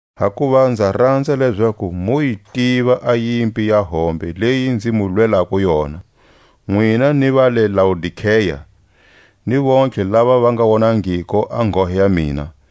Hakuva nza ranza lezaku mu yi tiva a yimpi ya hombe leyi nzi mu lwelako yona, nwina ni va le Laodikea, ni vontlhe lava va nga wonangiko a nghohe ya mina,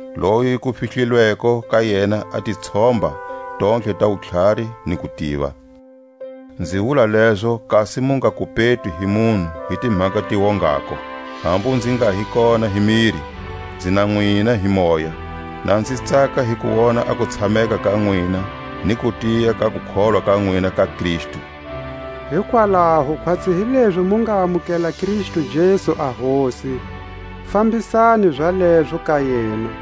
loyi ku fihlilweko ka yena a titshomba tontlhe ta wutlhari ni kutiva. Nzi wula lezo kasi mu nga kupetwi hi munhu hi timhaka ti wongako. Hambu nzi nga hi kona hi miri, nzi na nwina hi moya, na nzi tsaka hi ku wona a kutshameka ka nwina ni kutiya ka kukholwa ka nwina ka Kristu. Hikwalaho khwatsi hilezi mu nga amukela Kristu Jesu a Hosi, fambisani zalezo ka yena,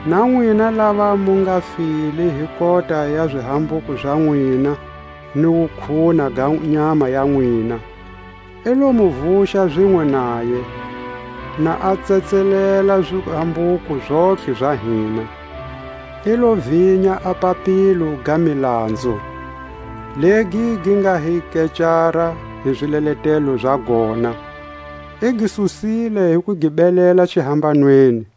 Na nwina lava mu nga file hi kota ya zihambuko za nwina ni wukhuna ga nyama ya nwina, i lo mu vuxa zinwe naye; na a tsetselela zihambuko zontlhe za hina. I lo vinya a papilo ga milanzu, legi gi nga hi kecara hi zileletelo za gona; i gi susile hi ku gi belela xihambanweni.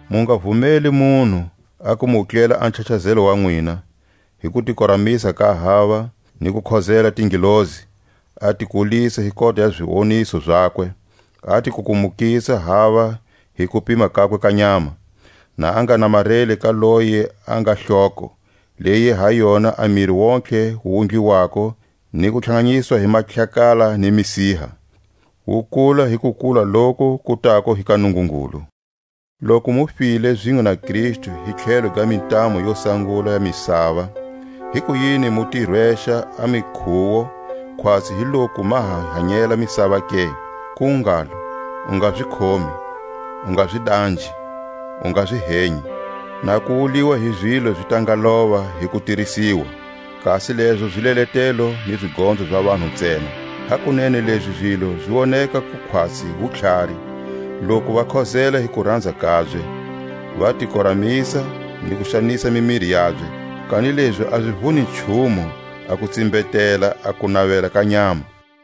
Mu nga vumeli munhu a ku mu wutlela a nchachazelo wa nwina, hi kutikoramisa ka hava ni ku khozela tingelosi, a ti kulisa hi kota ya ziwoniso zakwe, a ti kukumukisa hava hi kupima kakwe ka nyama, na a nga namareli ka loyi a nga Hloko, leyi ha yona a miri wontihe wu wundliwako ni ku tlhanganyiswa hi mahlakala ni misiha, wu kula hi kukula loku ku tako hi ka Nungungulu. Loku mu file zinwe na Kristu hi tlhelo ga mintamu yo sangula ya misava, hikuyini mu ti rwexa a mikhuwo, khwatsi hi loku ma ha hanyela misava ke? Ku ngalo: U nga zi khomi, U nga zi danjhi, U nga zi henyi! (Na ku wuliwa hi zilo zi ta nga lova hi kutirisiwa.) Kasi lezo zileletelo ni zigonzo za vanhu ntsena. Hakunene lezi zilo zi woneka ku khwatsi wutlhari, loku va khozela hi kuranza kabye, va ti koramisa ni ku xanisa mimiri yabye; kanilezi a zi vuni nchumu a ku tsimbetela a kunavela ka nyama.